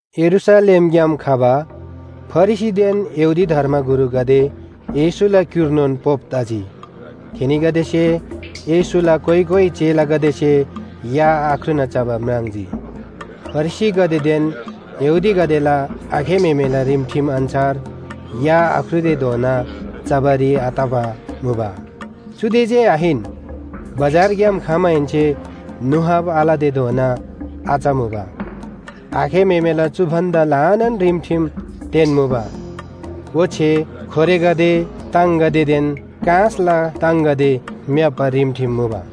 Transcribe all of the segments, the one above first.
यरूशलेमग्‍याम खबा फरिसीदेन यहूदी धर्मगुरुगदे येशूला क्‍युर्नोन पोप तजी। थेनीगदेसे येशूला कोइ कोइ चेलागदेसे या आख्रुना चबा म्राङ्जी। फरिसीगदेदेन यहूदीगदेला आखे म्‍हेमेला रिमठिम अन्‍छार या आख्रुतेधोना चबारी आतबा मुबा। चुदे जे आहिन बजारग्‍याम खमाहेन्‍से नुहाब आलतेधोना आचमुबा। आखे म्‍हेमेला चु भन्‍दा ल्‍हानान रिमठिम तेन्‍मुबा ओच्‍छे खोरेगदे, ताङगदेदेन काँसला ताङगदे म्‍याप्‍बा रिमठिम मुबा।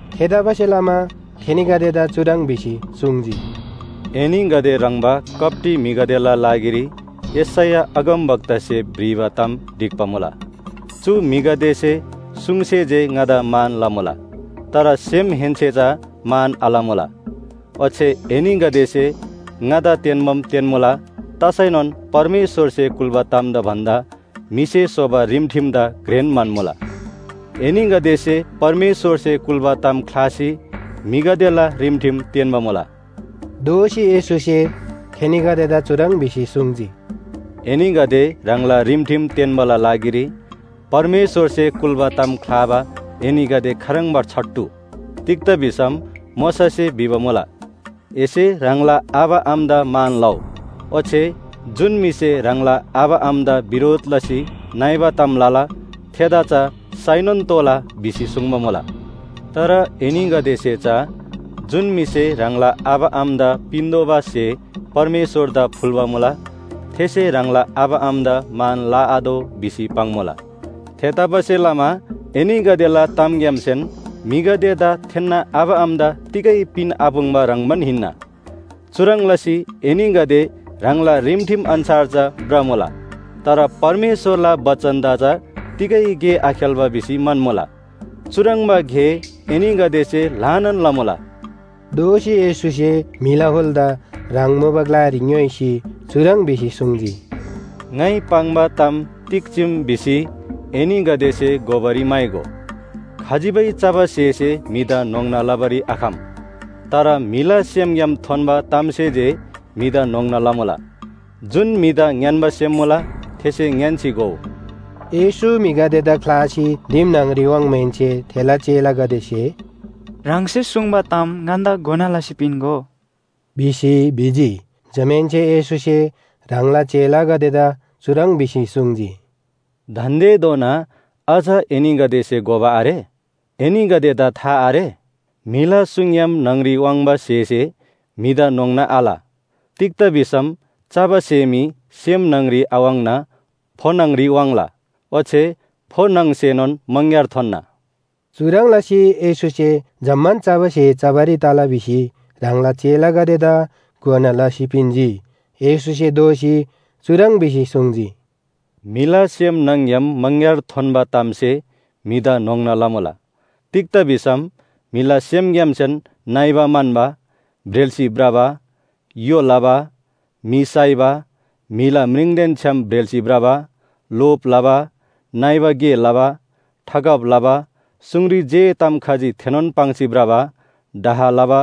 थेतबासेलमा थेनीगदेदा चुह्रङ् भिसी सुङ्जी, “एनीगदे ह्रङ्‌बा कप्‍टी म्‍हिगदेला लागिरी यशैया अगमवक्तासे भ्रिबा ताम ढिक्‍बा मुला, ‘चु म्‍हिगदेसे सुङसे जे ङादा मान लमुला, तर सेमहेन्‍से चा मान आलमुला। ओच्‍छे एनीगदेसे ङादा तेन्‍बाम तेन्‍मुला तसैनोन परमेश्‍वरसे कुल्‍बा तामदा भन्‍दा म्‍हिसे स्‍होबा रिमठिमदा घ्रेन म्‍हन्‍मुला।’ एनीगदेसे परमेश्‍वरसे कुल्‍बा ताम ख्‍लासी म्‍हिगदेला रिमठिम तेन्‍बा मुला।” दोःसी येशूसे थेनीगदेदा चुह्रङ् भिसी सुङ्जी, “एनीगदे ह्राङला रिमठिम तेन्‍बाला लागिरी परमेश्‍वरसे कुल्‍बा ताम ख्‍लाबा एनीगदे खाह्रङ्बा छट्टु? तिग्‍दा भिसम मोशासे भिबा मुला, ‘एसे ह्राङला आबा आमादा मान लउ,’ ओच्‍छे ‘जुन म्‍हिसे ह्राङला आबा आमादा बिरोध लसी नइबा ताम लला थेदा चा साइनोन तोःला’ भिसी सुङ्बा मुला। तर एनीगदेसे चा ‘जुन म्‍हिसे ह्राङला आबा आमादा पिन्‍तोःबा स्‍हे परमेश्‍वरदा फुल्‍बा मुला, थेसे ह्राङला आबा आमादा मान लआतोः’ भिसी पाङ्‌मुला। थेतबासेलमा एनीगदेला तामग्‍यामसेन म्‍हिगदेदा थेन्‍ना आबा आमादा तिगै पिनआपुङ्बा ह्रङ्‌बान हिन्‍ना। चुह्रङ् लसी एनीगदे ह्राङला रिमठिम अन्‍छार चा भ्रमुला। तर परमेश्‍वरला बचनदा चा तिगै गे आखेल्‍बा भिसी म्‍हन्‍मुला। चुह्रङ्बा गे एनीगदेसे ल्‍हानान लमुला।” दोःसी येशूसे म्‍हिला हुलदा ह्राङ मुबा ग्‍लारी ङ्‌योइसी चुह्रङ् भिसी सुङ्जी, “ङाइ पाङ्बा ताम तिग चीम भिसी एनीगदेसे घोबारी म्‍हाइगो। खजिबै चबा स्‍हेसे म्‍हिदा न्‍होङ्ना लबारी आखम। तर म्‍हिला सेमग्‍याम थोन्‍बा तामसे जे म्‍हिदा न्‍होङ्ना लमुला। जुन म्‍हिदा ङ्‌यान्‍बा सेम मुला थेसे ङ्‌यान्‍सी घोउ।” येशू म्‍हिगदेदा ख्‍लासी दिम न्‍हङरी वाङ्माहेन्‍से थेला चेलागदेसे “ह्राङसे सुङ्बा ताम ङन्‍दा घोना लसी पिन्‍गो” भिसी भिजी। जमाहेन्‍से येशूसे ह्राङला चेलागदेदा चुह्रङ् भिसी सुङ्जी, “दान्‍देधोना अझ एनीगदेसे घोबा आरे? एनीगदेदा था आरे? म्‍हिला सुङग्‍याम न्‍हङरी वाङ्बा स्‍हेसे म्‍हिदा न्‍होङ्ना आल। तिग्‍दा भिसम चबा स्‍हे मी सेम न्‍हङरी आवाङ्ना फो न्‍हङरी वाङ्ला ओच्‍छे फो न्‍हङसेनोन मङग्‍यार थोन्‍ना।” चुह्रङ् लसी येशूसे जम्‍मान चबा स्‍हे चबारी तला भिसी ह्राङला चेलागदेदा घोना लसी पिन्‍जी। येशूसे दोःसी चुह्रङ् भिसी सुङ्जी, “म्‍हिला सेम न्‍हङ‍ग्‍याम मङग्‍यार थोन्‍बा तामसे म्‍हिदा न्‍होङ्ना लमुला। तिग्‍दा भिसम म्‍हिला सेमग्‍यामसेन नइबा म्‍हन्‍बा, ब्रेल्‍सी भ्रबा, य्‍हो लबा, म्‍हि साइबा, म्‍हिला म्रिङदेन छ्‌याम ब्रेल्‍सी भ्रबा, लोभ लबा, नइबा गे लबा, ठगब लबा, सुङरी जे ताम खजी थेनोन पाङ्सी भ्रबा, डाह लबा,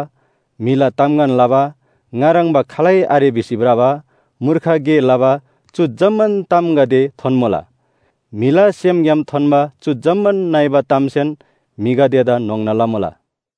म्‍हिला तामगन लबा, ङा ह्रङ्‌बा खालै आरे भिसी भ्रबा, मूर्ख गे लबा चु जम्‍मान तामगदे थोन्‍मुला। म्‍हिला सेमग्‍याम थोन्‍बा चु जम्‍मान नइबा तामसेन म्‍हिगदेदा न्‍होङ्ना लमुला।”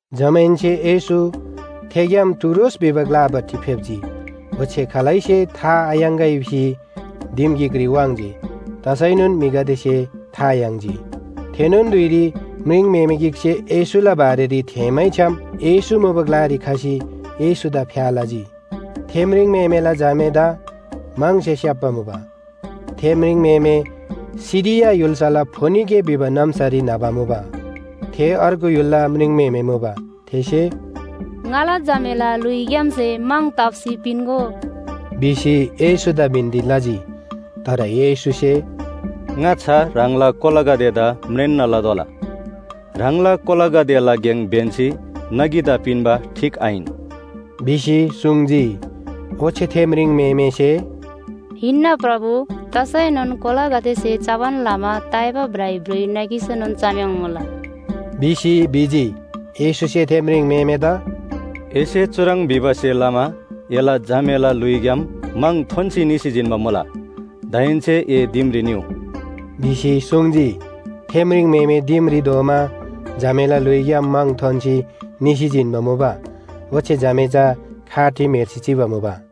जमाहेन्‍से येशू थेग्‍याम टुरोस भिबा ग्‍लापट्टि फेप्‍जी। ओच्‍छे खालैसे था थायाङ्‍गै भिसी दिम गिकरी वाङ्‌जी तसैनोन म्‍हिगदेसे था याङ्जी। थेनोन धुइरी म्रिङम्‍हेमे गिकसे येशूला बारेरी थेःमैछ्‌याम येशू मुबा ग्‍लारी खसी येशूदा फ्‍या लजी। थे म्रिङम्‍हेमेला झामेदा म्‍हङसे स्‍याप्‍बा मुबा। थे म्रिङम्‍हेमे सिरिया य्‍हुल्‍साला फोनिके भिबा नाम्‍सारी न्‍हबा मुबा। थे अर्गु य्‍हुलला म्रिङम्‍हेमे मुबा। थेसे “ङाला झामेला ल्‍हुइग्‍यामसे म्‍हङ ताप्‍सी पिन्‍गो” भिसी येशूदा बिन्‍ती लजी। तर येशूसे “ङाच्‍छा ह्राङला कोलागदेदा म्रेन्‍ना लतोःला, ह्राङला कोलागदेला गेङ ब्‍यन्‍सी नगीदा पिन्‍बा ठीक आहिन” भिसी सुङ्जी। ओच्‍छे थे म्रिङम्‍हेमेसे “हिन्‍ना प्रभु, तसैनोन कोलागदेसे चबान लमा ताइबा भ्राइभ्रुइ नगीसेनोन चम्‍याङ्मुला” भिसी भिजी। येशूसे थे म्रिङम्‍हेमेदा “एसे चुह्रङ् भिबासे लमा एला झामेला ल्‍हुइग्‍याम म्‍हङ थोन्‍सी निसी जिन्‍बा मुला। दाहेन्‍से ए दिमरी निउ” भिसी सुङ्जी। थे म्रिङम्‍हेमे दिमरी धोमा झामेला ल्‍हुइग्‍याम म्‍हङ थोन्‍सी निसी जिन्‍बा मुबा, ओच्‍छे झामे चा खाटरी म्‍हेर्सी चिबा मुबा।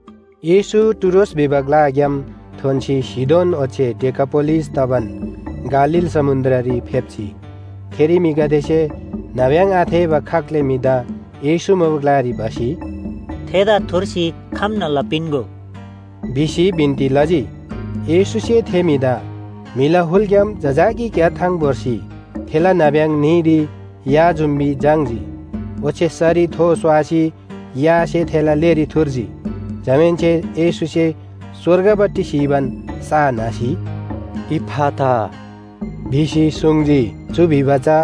येशू टुरोस भिबा ग्‍लाग्‍याम थोन्‍सी सीदोन ओच्‍छे डेकापोलिस तबान गालील समुन्‍द्ररी फेप्‍जी। थेरी म्‍हिगदेसे नाब्‍यङ आथेःबा खाग्‍ले म्‍हिदा येशू मुबा ग्‍लारी भसी, “थेदा थुर्सी खम्‍ना लपिन्‍गो” भिसी बिन्‍ती लजी। येशूसे थे म्‍हिदा म्‍हिला हुलग्‍याम जजाकी क्‍याथाङ भोर्सी थेला नाब्‍यङ न्‍हीरी या जुम्‍बी झाङ्‌जी। ओच्‍छे सरी थो स्‍वासी यासे थेला लेरी थुर्जी। जमाहेन्‍से येशूसे स्‍वर्गपट्टि स्‍हीबान सा न्‍हसी, “इफ्‍फाता” भिसी सुङ्जी। चु भिबा चा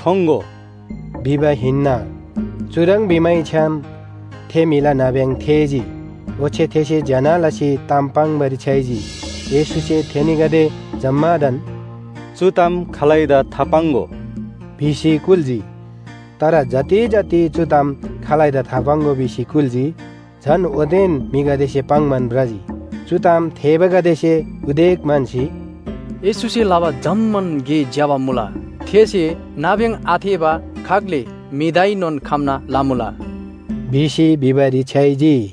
“ठोङ्‍गो” भिबा हिन्‍ना। चुह्रङ् भिमैछ्‌याम थे म्‍हिला नाब्‍यङ थेःजी ओच्‍छे थेसे ज्‍यना लसी ताम पाङ्‌बारी छ्‌याइजी। येशूसे थेनीगदे जम्‍मादान “चु ताम खालैदा थापाङ्‍गो” भिसी कुल्‍जी। तर जति जति चु ताम खालैदा थापाङ्‍गो भिसी कुल्‍जी, झन ओतेन म्‍हिगदेसे पाङ्‌बान भ्रजी। चु ताम थेःबागदेसे उदेक म्‍हन्‍सी, “येशूसे लबा जम्‍मान गे ज्‍यबा मुला। थेसे नाब्‍यङ आथेःबा खाग्‍ले म्‍हिदाएनोन खम्‍ना लमुला” भिसी भिबारी छ्‌याइजी।